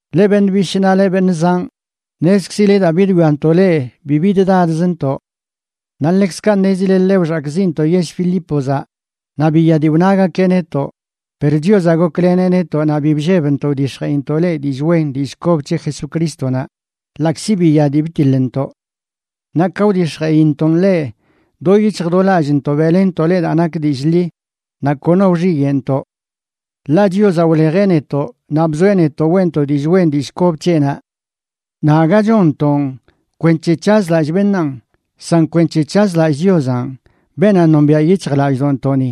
Leꞌ beṉꞌ bishꞌ naꞌ leꞌ beṉꞌ zanꞌ, ṉezkzile daa bidwiantoꞌ leꞌ bi biddadzntoꞌ. Naꞌ ḻekzkaꞌ ṉezile ḻe wxakꞌziꞌntoꞌ yell Filípozaꞌ naꞌ biya dii wnagakeꞌ netoꞌ, per Chiozaꞌ gokleneꞌ netoꞌ naꞌ bi bllebntoꞌ wdix̱jeꞌintoꞌ leꞌ dillꞌ wen dillꞌ kob c̱he Jesucrístonaꞌ ḻaꞌkzi biya dii btiḻntoꞌ. Naꞌ ka wdix̱jeꞌintoꞌn leꞌ, do yic̱hj do lallꞌntoꞌ beꞌlenntoꞌ leꞌ daa nak dillꞌ ḻi, naꞌ kono wxiyeꞌntoꞌ. Ḻaꞌ Chiozaꞌ wlejeꞌ netoꞌ naꞌ bzoeꞌ netoꞌ weꞌntoꞌ dillꞌ wen dillꞌ kob c̱heꞌnaꞌ. Naꞌ aga chonntoꞌn kwenc̱he c̱hazlallꞌ beṉaan, san kwenc̱he c̱hazlallꞌ Chiozanꞌ, beenaꞌ nombiaꞌ yic̱hjlallꞌdoꞌntoꞌni.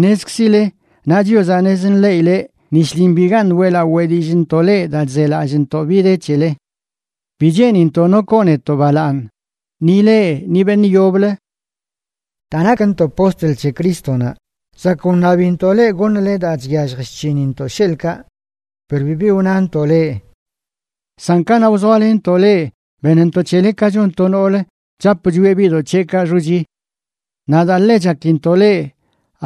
Ṉezkzile, naꞌ Chiozaꞌ ṉez nḻeꞌileꞌ, ni shlin bigaṉꞌ weꞌlaꞌo weꞌ dillꞌntoꞌ leꞌ daa chzelallꞌntoꞌ bi de c̱hele. Bi cheenintoꞌ no koo netoꞌ balaaṉ, ni leꞌ ni beṉꞌ yoblə. Daa nakntoꞌ postl c̱he Crístonaꞌ, zakꞌ wṉabintoꞌ leꞌ goṉle daa chyallj chc̱hinintoꞌ sheḻꞌkaꞌ, per bibi wnantoꞌ leꞌ. San kanaꞌ wzoalenntoꞌ leꞌ benntoꞌ c̱hele ka chon to noolə chap chwieꞌ biꞌdoꞌ c̱heꞌkaꞌ xochi. Naꞌ daa ḻe chakintoꞌ leꞌ,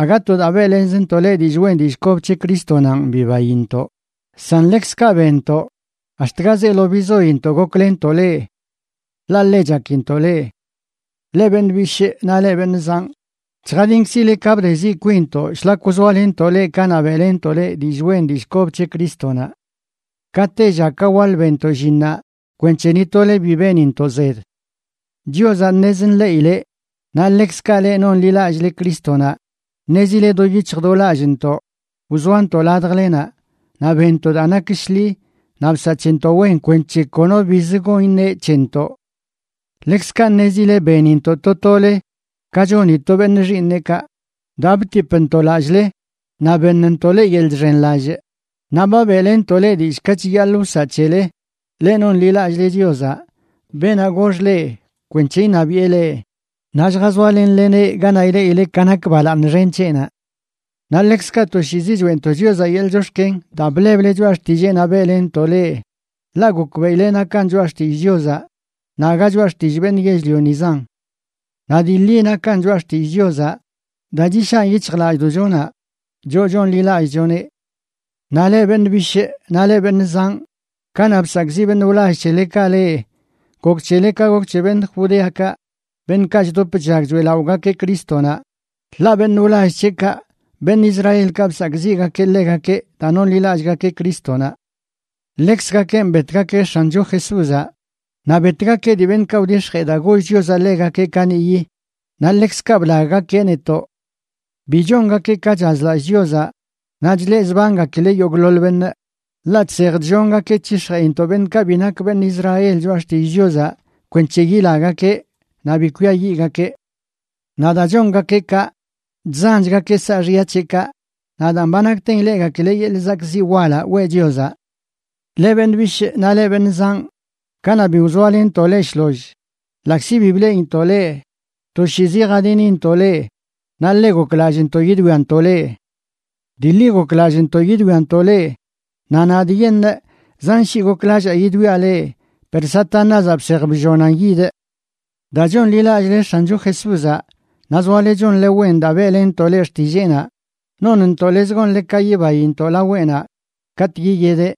aga to daa beꞌlenzntoꞌ leꞌ dillꞌ wen dillꞌ kob c̱he Crístonanꞌ bibaintoꞌ, san ḻekzkaꞌ benntoꞌ ax̱t ga zeelo bizointoꞌ goklenntoꞌ leꞌ. Ḻaꞌ ḻe chakintoꞌ leꞌ. Leꞌ beṉꞌ bishꞌ naꞌ leꞌ beṉꞌ zanꞌ, chjadinkzile ka bdeziꞌ kwinntoꞌ shlak wzoalenntoꞌ leꞌ kanaꞌ beꞌlenntoꞌ leꞌ dillꞌ wen dillꞌ kob c̱he Crístonaꞌ. Ka tella ka waḻ benntoꞌ llinnaꞌ kwenc̱he ni tole bi benintoꞌ zed. Chiozaꞌ ṉez nḻeꞌileꞌ, naꞌ ḻekzkaꞌ leꞌ nonḻilallꞌle Crístonaꞌ, ṉezile do yic̱hj do lallꞌntoꞌ wzoantoꞌ ladjlenaꞌ, naꞌ benntoꞌ daa nak shḻi naꞌ bsaꞌ c̱hentoꞌ wen kwenc̱he kono biz gon iṉe c̱hentoꞌ. Ḻekzkaꞌ ṉezile benintoꞌ to tole ka choni to beṉꞌ xiiṉeꞌkaꞌ daa btipntoꞌ lallꞌle, naꞌ beṉntoꞌ leꞌ yeḻꞌ chxenlallꞌ, naꞌ ba beꞌlenntoꞌ leꞌ dillꞌ ka chiyaḻꞌ wsaꞌ c̱hele, leꞌ nonḻilallꞌle Chiozaꞌ, beenaꞌ gox leꞌ kwenc̱he iṉabiꞌe leꞌ naꞌ lljazoalenleneꞌ ganaꞌ ileꞌile ka nak balaaṉ xen c̱heꞌnaꞌ. Naꞌ ḻekzkaꞌ toshiizi choeꞌntoꞌ Chiozaꞌ yeḻꞌ chox̱ken daa bleble choꞌa xtilleenaꞌ beꞌlenntoꞌ leꞌ, ḻaꞌ gokbeꞌileꞌ nakan choꞌa xtillꞌ Chiozaꞌ naꞌ aga choꞌa xtillꞌ beṉꞌ yell-lionizan. Naꞌ dii ḻi nakan choꞌa xtillꞌ Chiozaꞌ daa chishaꞌn yic̱hjlallꞌdoꞌchonaꞌ, choꞌ chonḻilallꞌchoneꞌ. Naꞌ leꞌ beṉꞌ bishꞌ naꞌ leꞌ beṉꞌ zanꞌ, kanaꞌ bsakꞌziꞌ beṉꞌ wlall c̱helekaꞌ leꞌ, gok c̱hele ka gok c̱he beṉꞌ Judeakaꞌ, beṉꞌkaꞌ chdop chllag choeꞌlaꞌogakeꞌ Crístonaꞌ, ḻaꞌ beṉꞌ wlall c̱heꞌkaꞌ, beṉꞌ Israelkaꞌ, bsakꞌziꞌgakeꞌ ḻegakeꞌ daa nonḻilallꞌgakeꞌ Crístonaꞌ. Ḻekzgakenꞌ betgakeꞌ X̱ancho Jesúzaꞌ naꞌ betgakeꞌ dii beṉꞌkaꞌ wdix̱jee daa goll Chiozaꞌ ḻegakeꞌ kaniꞌyi, naꞌ ḻekzkaꞌ blaggakeꞌ netoꞌ. Bi chongakeꞌ ka chazlallꞌ Chiozaꞌ naꞌ chleꞌzbangakileꞌ yogꞌḻoḻ beṉꞌ, ḻaꞌ chsej chllongakeꞌ c̱hix̱jeꞌintoꞌ beṉꞌkaꞌ bi nak beṉꞌ Israel choꞌa xtillꞌ Chiozaꞌ kwenc̱he yilagakeꞌ naꞌ bi kwiayiꞌgakeꞌ. Naꞌ daa chongakeꞌ kaꞌ, chzanchgakeꞌ saaxya c̱heꞌkaꞌ, naꞌ daan, ba nakten ileꞌgakileꞌ yeḻꞌ zakꞌziꞌ walaꞌ weꞌ Chiozaꞌ. Leꞌ beṉꞌ bishꞌ naꞌ leꞌ beṉꞌ zanꞌ, kanaꞌ bi wzoalenntoꞌ leꞌ shloll, ḻaꞌkzi bi bleꞌintoꞌ leꞌ, toshiizi jadinintoꞌ leꞌ naꞌ ḻe goklallꞌntoꞌ yidwiantoꞌ leꞌ. Dii ḻi goklallꞌntoꞌ yidwiantoꞌ leꞌ, naꞌ nadꞌyeṉꞌ zan shii goklallaa yidwiaꞌ leꞌ, per Satanázaꞌ bsej bllonan yidꞌ. Daa chonḻilallꞌle X̱ancho Jesúzaꞌ naꞌ zoale chonle wen daa beꞌlentoꞌ leꞌ xtilleenaꞌ, nonntoꞌ lez gonle ka yibaintoꞌ laweꞌnaꞌ katꞌ yiyedeꞌ.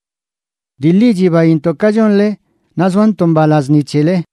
Dii ḻi, chibaintoꞌ ka chonle naꞌ zoantoꞌ mbalaz ni c̱hele.